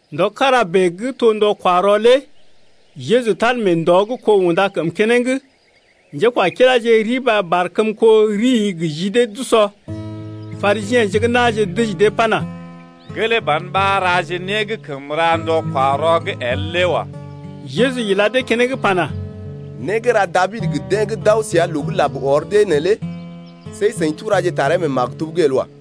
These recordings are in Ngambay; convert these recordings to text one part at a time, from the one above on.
Ndɔ kára bèe gə́ to ndɔ-kwa-rɔ lé Jeju tal mee ndɔ gə́ kó unda kəm keneŋ. Njékwakiláje riba barkəmko rii gə ji dee d’usɔ. Parisiḛje gə́ na̰je dəji dee pana: Gelee ban ɓa raje né gə́ kəm ra ndɔ-kwa-rɔ’g el lé wa. Jeju ila dee keneŋ pana: Né gə́ ra Dabid gə deḛ gə́ d’aw səa loo gə́ lab ɔr dee neelé see seḭ turaje taree mee maktub’g el wa.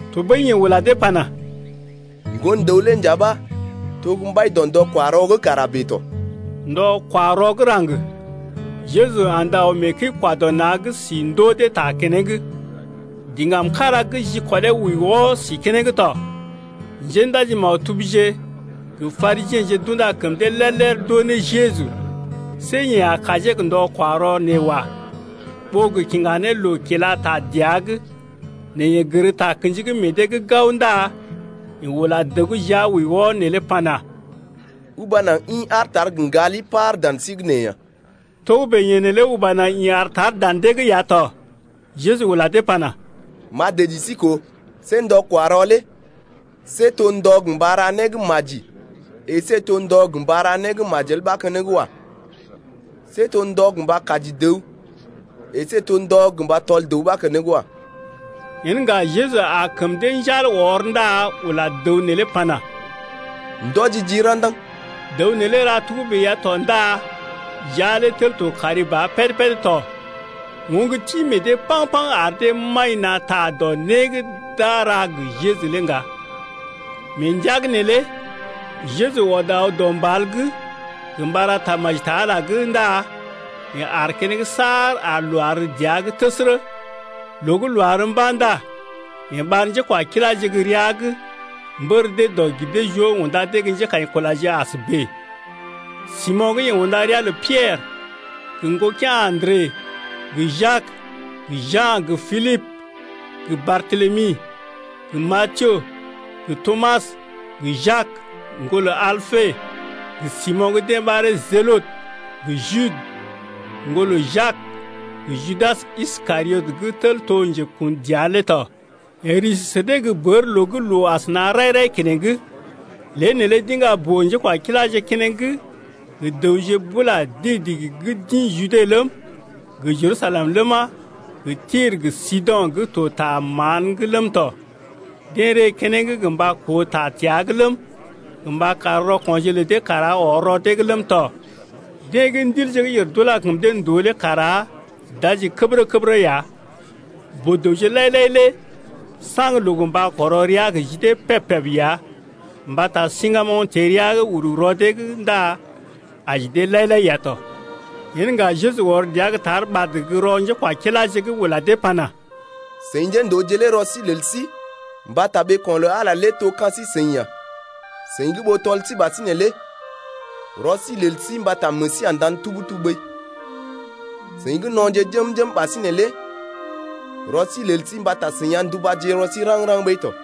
Tɔɓəi yeḛ ula dee pana: Ŋgon-dəw lé nja ɓa to gə́ mbai dɔ ndɔ-kwa-rɔ lé tɔ. Ndɔ-kwa-rɔ gə́ raŋg, Jeju andə aw mee kəi-kwa-dɔ-na̰’g si ndoo dee ta keneŋ. Diŋgam kára gə́ jikɔlee wəi wɔ si keneŋ tɔ. Njéndaji-maktubje gə Parisiḛje d’unda kəm dee lér-lér d’oo ne Jeju, see yeḛ a kajee gə ndɔ-kwa-rɔ nee wa, ɓó gə kiŋga ne loo kila ta dəa’g. Nɛ yeḛ gər takə̰ji gə́ meḛ dee’g gao ndá yeḛ ula dəw gə́ jia wəi wɔ neelé pana: Uba naŋg ḭ aar tar gə ŋgali par dan sí’g nee ya. Togə́bè yeḛ neelé uba naŋg ḭ aar tar dan dee’g ya tɔ. Jeju ula dee pana: M’a dəji sí koo, see ndɔ-kwa-rɔ lé see to ndɔ gə mba ra né gə́ maji əsé to ndɔ gə mba ra né gə́ majel ɓa keneŋ wa. See to ndɔ gə mba kaji dəw əsé to ndɔ gə mba tɔl dəw ɓa keneŋ wa. Yen ŋga Jeju aa kəm dee njal ɔr ndá ula dəw neelé pana: Ndɔji jii ra̰daŋ. Dəw neelé ra togə́bè ya tɔ ndá jia lé tel to kari ba péd-péd tɔ. Oŋg ti meḛ dee paŋ-paŋ ar dee maḭ na̰ ta dɔ né gə́ d’a ra gə Jeju lé ŋga. Mee ndəa’g neelé Jeju ɔd aw dɔ mbal’g gə mba ra tamaji ta Ala’g ndá yeḛ ar keneŋ saar ar loo àr dəa’g təsərə. Loo gə́ loo àr mba̰ ndá yeḛ ɓar njékwakiláje gə́ rəa’g mbər dee dɔg-gir-dee-joo unda dee gə́ njékaḭkulaje as bèe: Simo̰ gə́ yeḛ unda ria lə Piɛrə gə ŋgokea̰ Andre, gə Jak gə Ja̰ gə Pilibə gə Bartelemi gə Matiyo gə Tomas gə Jak, ŋgolə Alpe, gə Simo̰ gə́ deḛ ɓaree Jelote, gə Jude, ŋgolə Jak, gə Judas Iskariot gə́ tel to njekun dəa lé tɔ. Yeḛ risi sə dee gə́ bər loo gə́ loo asəna rai-rai keneŋ, lée neelé d’iŋga boo-njékwakiláje keneŋ gə dəwje bula digi-digi gə́ d’ḭ Jude ləm, gə Jerusalem ləma, gə Tir gə Sido̰ gə́ to ta mán’g ləm tɔ. Deḛ ree keneŋ gə mba koo ta təa’g ləm, gə mba kar rɔko̰je lə dee kara ɔr rɔ dee’g ləm tɔ. Deḛ gə́ ndilje gə́ yèr d’ula kəm dee ndòo lé kara d’aji kəbərə-kəbərə ya. Boo-dəwje lai-lai lé saŋg loo gə mba kɔrɔ rəa gə́ ji dee peb-peb ya mbata siŋgamoŋ teḛ rəa’g uru rɔ dee’g ndá aji dee lai-lai ya tɔ. Yen ŋga Jeju ɔr dəa gə́ tar ɓad gə́ rɔ njékwakiláje’g ula dee pana: Seḭ njéndooje lé rɔ sí lel sí Mbata ɓeeko̰ lə Ala lé to ka̰ sí-seḭ ya! Seḭ gə́ ɓó tɔl sí ɓasinè lé Rɔ sí lel sí mbata meḛ sí a ndan tub-tub ɓəi! Seḭ gə́ no̰je jəm-jəm ɓasinè lé Rɔ sí lel sí mbata seḭ a ndubaje rɔ sí raŋg-raŋg ɓəi to!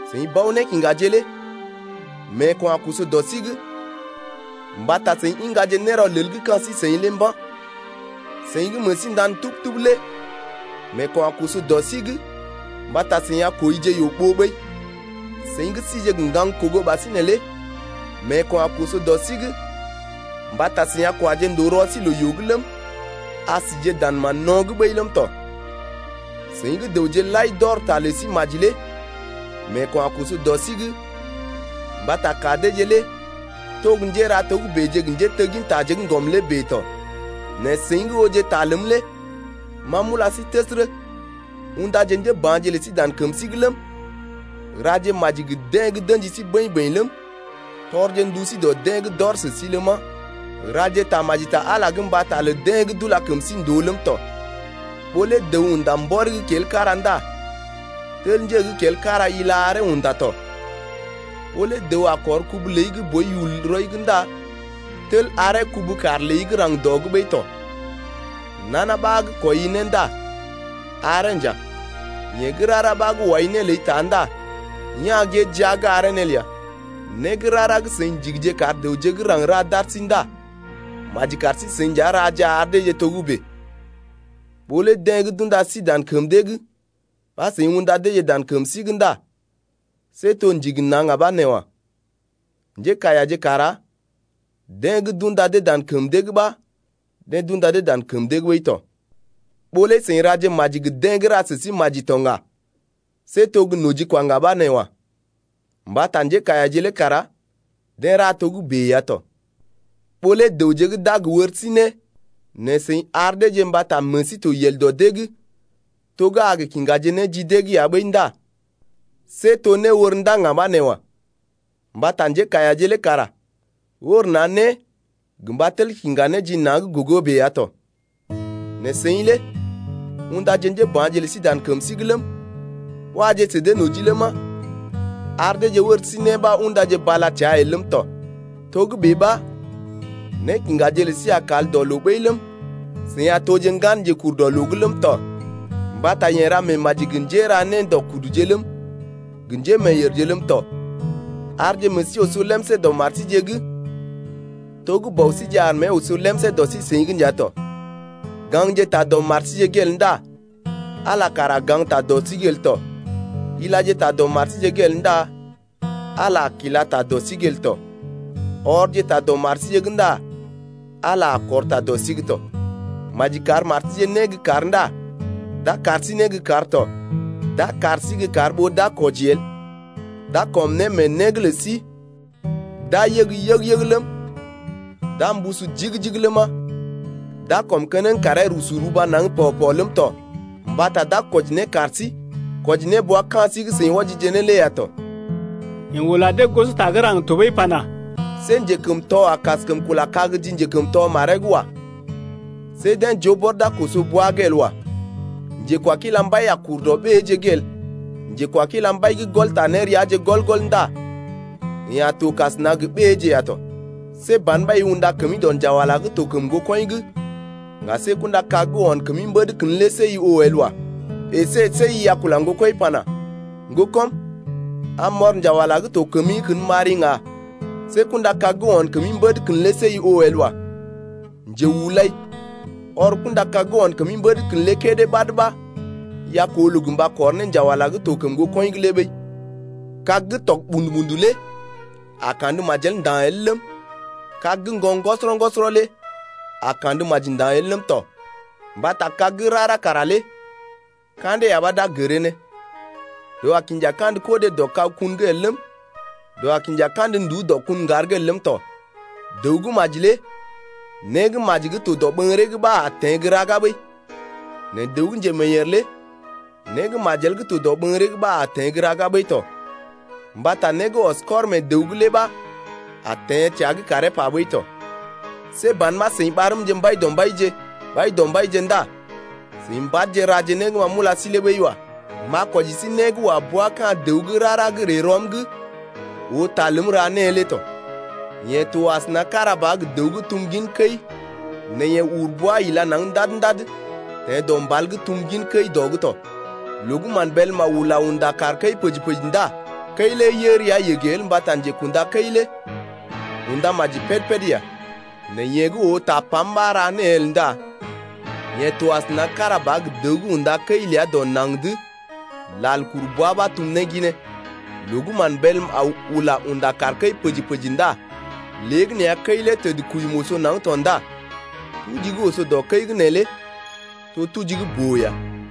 Seḭ bao-nékiŋgaje lé meeko̰ a koso dɔ sí’g, Mbata seḭ iŋgaje nérɔlel gə́ ka̰ sí-seḭ lé mba̰. Seḭ gə́ meḛ sí ndan tub-tub lé meeko̰ a koso dɔ sí’g Mbata seḭ a kwəije yoo-ɓoo ɓəi. Seḭ gə́ síje gə ŋgaŋ-kogo ɓasinè lé meeko̰ a koso dɔ sí’g Mbata seḭ a kwaje ndòo rɔ sí loo-yoo’g ləm, A sije dan mán-no̰’g ɓəi ləm tɔ. Seḭ gə́ dəwje lai d’ɔr ta lə sí maji lé meeko̰ a koso dɔ sí’g mbata ka deeje lé to gə́ njéra né togəbèje gə njéteggintaje gə́ ŋgɔm lé bèe tɔ. Nɛ seḭ gə́ ooje ta ləm lé ma m’ula sí təsərə, undaje njéba̰je lə sí dan kəm sí’g ləm, raje maji gə deḛ gə́ d’ə̰ji sí bəḭ-bəḭ ləm, tɔrje ndu sí dɔ deḛ gə́ d’ɔr sə sí ləma, raje tamaji ta Ala’g mbata lə deḛ gə́ d’ula kəm sí ndòo ləm tɔ. Ɓó lé dəw unda mbɔri gə́ kel kára ndá tel nje gə́ kel kára ila aree unda tɔ. Ɓó lé dəw a kɔr kubu ləi gə́ boi yul rɔi’g ndá tel aree kubu-kaar ləi gə́ raŋg dɔ’g ɓəi tɔ. Nana ɓa gə́ kwɔii né ndá aree nja, yeḛ gə́ rara ɓa gə́ wai né ləi taai ndá ya̰ gée jia’g aree né ləa. Né gə́ rara gə́ seḭ ndigije kar dəwje gə́ raŋg ra d’ar sí ndá maji kar sí-seḭ nja raje ar deeje togə́bè. Ɓó lé deḛ gə́ d’unda sí dan kəm dee’g ɓa seḭ undaje deeje dan kəm sí’g ndá see to ndigi na̰ ŋga ɓa nee wa. Njékaiyaje kara deḛ gə́ d’unda dee dan kəm dee’g ɓa deḛ d’unda dee dan kəm dee’g ɓəi tɔ. Ɓó lé seḭ raje maji gə deḛ gə́ ra sə sí maji ya to ŋga see to gə́ nojikwa ŋga ɓa nee wa. Mbata njékaiyaje lé kara deḛ ra togə́bè ya tɔ. Ɓó lé dəwje gə́ d’a gə wɔr sí né nɛ seḭ ar deeje mbata meḛ sí to yel dɔ dee’g to gə́ a kiŋgaje né ji dee’g ya ɓəi ndá see to néwor ndá ŋga ɓa nee wa. Mbata njékaiyaje lé kara wɔr na̰ né gə mba tel kiŋga né ji na̰’d gogo bèe ya tɔ. Nɛ seḭ lé undaje njéba̰je lə sí dan kəm sí’g ləm, waje sə dee noji ləma, ar deeje wɔr sí né ɓa undaje bala təa el ləm tɔ. Togə́bè ɓa nékiŋgaje lə sí a kal dɔ loo ɓəi ləm, seḭ a toje ŋgan Njekurdɔloo’g ləm tɔ mbata yeḛ ra meemaji gə njéra nédɔkuduje ləm, gə njémeeyèrje ləm tɔ. Arje meḛ sí oso lemsé dɔ mar síje’g to gə́ bɔ síje ar mée oso lemsé dɔ sí-seḭ’g nja tɔ. Gaŋje ta dɔ mar síje’g el ndá Ala kara a gaŋgta dɔ sí’g el tɔ, ilaje ta dɔ mar síje’g el ndá Ala a kila ta dɔ sí’g el tɔ, ɔrje ta dɔ mar síje’g ndá Ala a kɔr ta dɔ sí’g tɔ. Maji kar mar síje né gə́ kar ndá d’a kar sí né gə kar tɔ, d’a kar sí gə́ kar ɓó d’a kwɔji el, d’a kɔm né mee né’g lə sí, d’a yəg yəg-yəg ləm, d’a mbusu jigi-jigi ləma, d’a kɔm keneŋ karee rusu ruba naŋg pɔ-pɔ ləm tɔ, mbata d’a kwɔji né kar sí kwɔji ne bua ka̰ sí gə́ seḭ wɔjije ne lé ya tɔ. Yeḛ ula dee gosota gə́ raŋg tɔɓəi pana: See njekəmtɔ a kaskəm kula kag ji njekəmtɔ maree’g wa. See deḛ joo bɔr d’a koso bwa’g el wa. Njekwakila mbai a kur dɔ ɓéeje’g el, njekwakila mbai gə́ gɔl ta néreaje gɔl-gɔl ndá yeḛ a to kasəna gə ɓéeje ya tɔ. See ban ɓa i unda kəmi dɔ njawala gə́ to kəm ŋgokɔḭ’g ŋga see guburu kag gə́ o̰ kəmi mbèd kən lé see i oo el wa. Esé see i a kula ŋgokɔḭ pana: Ŋgokɔm, am m’ɔr njawala gə́ to kəmi’g kən m’ari ŋga see guburu kag gə́ o̰ kəmi mbèd kən lé see i oo el wa. Njehulai, ɔr guburu kag gə́ o̰ kəmi mbèd kən lé kédé ɓad ɓa i a koo loo gə mba kɔr ne njawala gə́ to kəm ŋgokɔḭ’g lé ɓəi. Kag gə́ tɔg ɓṵdu-ɓṵdu lé a kandə majel nda̰ el ləm, kag gə́ ŋgon ŋgɔsɔrɔ-ŋgɔsɔrɔ lé a kandə maji nda̰ el ləm tɔ. Mbata kag gə́ rara kara lé ka̰dee ya ɓa d’a gəree ne. Dəw a kinja kandə kodé dɔ kag-kun’g el ləm, dəw a kinja kandə nduú dɔ kun ŋgar’g el ləm tɔ. Dəw gə́ maji lé né gə́ maji gə́ to dɔɓəŋgəree’g ɓa a teḛ gə́ raga ɓəi, nɛ dəw gə́ njemeeyèr lé né gə́ majel gə́ to dɔɓəŋgəree’g ɓa a teḛ gə́ raga ɓəi tɔ, mbata né gə́ ɔs kɔr mee dəw’g lé ɓa a teḛ təa’g karee pa ɓəi tɔ. See ban ɓa seḭ ɓarmje Mbaidɔmbaije, Mbaidɔmbaije ndá seḭ mbad raje né gə́ ma m’ula sí lé ɓəi wa. M’a kwɔji sí né gə́ wa bua ka̰ dəw gə́ rara gə́ ree rɔm’g oo ta ləm gə́ ra née lé tɔ. Yeḛ to asəna kára ba gə dəw gə́ tum gin kəi nɛ yeḛ uru bwa ila naŋg ndad-ndad gə́ teḛ dɔ mbal’g tum gin kəi dɔ’g tɔ. Loo gə́ mán bélm aw ula unda kaar kəi pəji-pəji ndá kəi lé yə rəa yəgə el mbata njekunda kəi lé unda maji péd-péd ya. Nɛ yeḛ gə́ oo tapam ɓa ra née el ndá yeḛ to asəna kára ba gə dəw gə́ unda kəi ləa dɔ naŋg’d lal kuru bwa ɓa tum ne ginee. Loo gə́ mán bélm aw ula unda kaar kəi pəji-pəji ndá léegəneeya kəi lé təd kuyum oso naŋg tɔ ndá tuji gə́ oso dɔ kəi’g neelé to tuji gə́ boo ya.